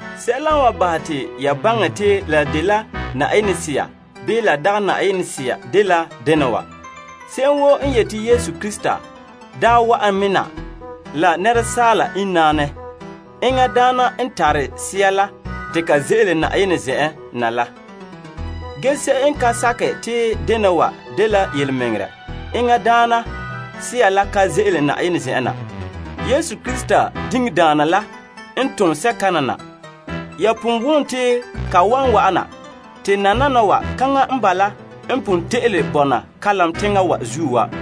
Sɛla n wan bahɛ te ya baŋɛ te la dela Yenɛ Sea, bii la dagɛ Yenɛ Sea dela dena wa: se'em woo n yeti Yesu Krista daa wa'an me na la asaala inŋ naanɛ, enŋa daana n tare Sea la te ka ze'ele Na'ayenɛ zen'en na la. Ge se'em n ka sakɛ te dena wa dela yelemɛŋɛrɛ, enŋa daana sea la ka ze'ele Na'ayenɛ zen'en na. Yesu Krista diŋdaana la n tom sea kana na. Ya pon wom te ka wan wa'ana. Te nananawa, kaŋa n bala n pon te'ele bɔna kalam teŋa wa zuo wa.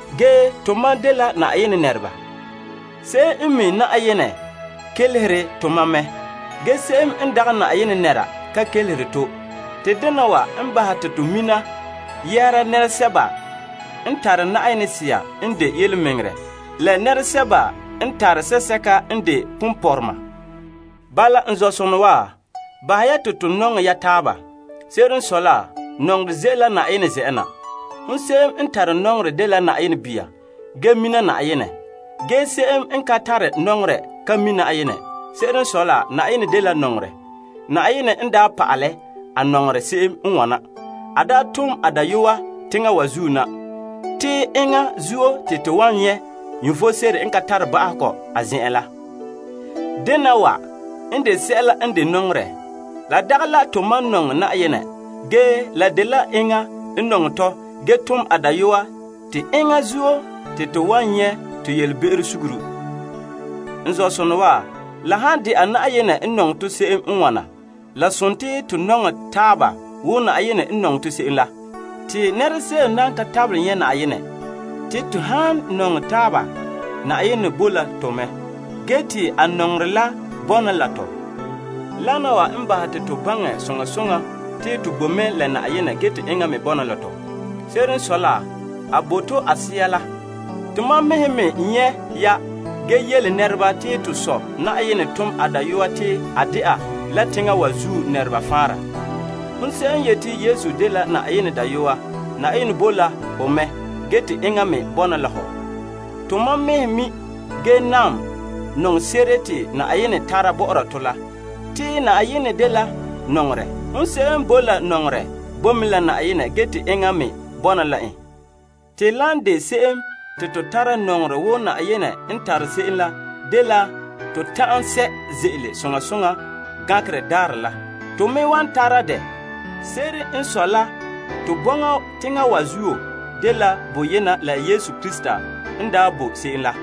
Ge tomam dela Yenɛ nɛreba. Se'em n mi' Yenɛ, kelehere tomam mɛ. Ge se'em n dagɛ Yenɛ nɛra ka kelehere to. Te dena wa n bahɛ te to mina yɛhera nɛresɛba n tare Sea n de yelemɛŋɛrɛ, la nɛresɛba n tare sea sɛka n de ponpɔrɔma. Bala, n zɔ'sonɔ wa, bahɛ ya te to nɔŋɛ ya taaba. Se'ere n sɔe la, nɔŋerɛ ze'ele la Yenɛ zen'en na. Hon se'em n tare nɔŋerɛ dela Yenɛ bia, ge mina Yenɛ. Ge se'em n ka tare nɔŋerɛ ka mi' Yenɛ. Se'ere n sɔe la Yenɛ dela nɔŋerɛ. Yenɛ n daa pa'alɛ a nɔŋerɛ se'em n wana: a daa tom a Dayɔyeŋa teŋa wa zuo na. Te enŋa zuo te to wan tara vom. Dena wa n de sɛla n de nɔŋerɛ. La dagɛ la tomam nɔŋɛ Yenɛ. Ge la dela enŋa n nɔŋɛ tɔ ge tom a Dayɔa te enŋa zuo te to wan nyɛ' to yelebe'ero suguru. N zɔ'sonɔ wa, la han de'a Yenɛ n nɔŋɛ tɔ se'em n wana, la dela tomam mɛ nɔŋɛ taaba wo Yenɛ n nɔŋɛ to se'em la. Te nɛra se'em nan ka tabelɛ nyɛ' Yenɛ. Te to han nɔŋɛ taaba, Yenɛ boe la tɔ mɛ, ge te a nɔŋerɛ la bɔna la tɔ zo'e zo'e. Wana wa n bahɛ te to baŋɛ soŋa soŋa te to bo mɛ la Yenɛ ge te enŋa me bɔna la tɔ. Se'ere n sɔe la, a bo to a Sea la. Tomam mɛhe me nyɛ' ya ge yele nɛreba te to Sɔ' tom a Dayɔa te a de'a la teŋa wa zuo faanra. Hon se'em n yeti Yesu dela Yenɛ Dayɔa, Yenɛ boe la ho mɛ te hom me bɔna la en. Tomam mɛhe mi' ge nam nɔŋse'ere te Yenɛ tara bɔ'ɔra tɔ la. Te Yenɛ dela nɔŋerɛ. Hon se'em n boe la nɔŋerɛ, bo mɛ la Yenɛ ge te enŋa me bɔna la en. Te lan de se'em te to tara nɔŋerɛ wo Yenɛ n tare se'em la dela to ta'an sɛ' ze'ele soŋa soŋa Gankerɛ Daarɛ la. To me wan tara dɛ. Se'ere n sɔe la to bɔŋa teŋa wa zuo dela boyena la Yesu Krista n daa boe se'em la.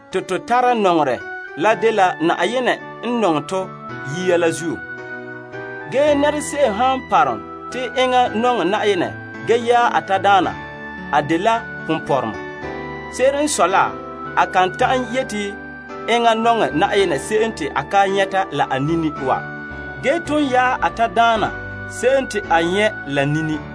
Tomam tare nɔŋerɛ, Yenɛ n nɔŋɛ to yia la zuo. Ge nɛra se'em han parom te enŋa nɔŋɛ Yenɛ ge yaɛ a tadaana, a dela ponpɔrɔma. Se'ere n sɔe la, a kan ta'an yeti enŋa nɔŋɛ Yenɛ se'em te a ka nyɛ' la a nini wa. Ge ton yaɛ a tadaana se'em te a nyɛ' la nini.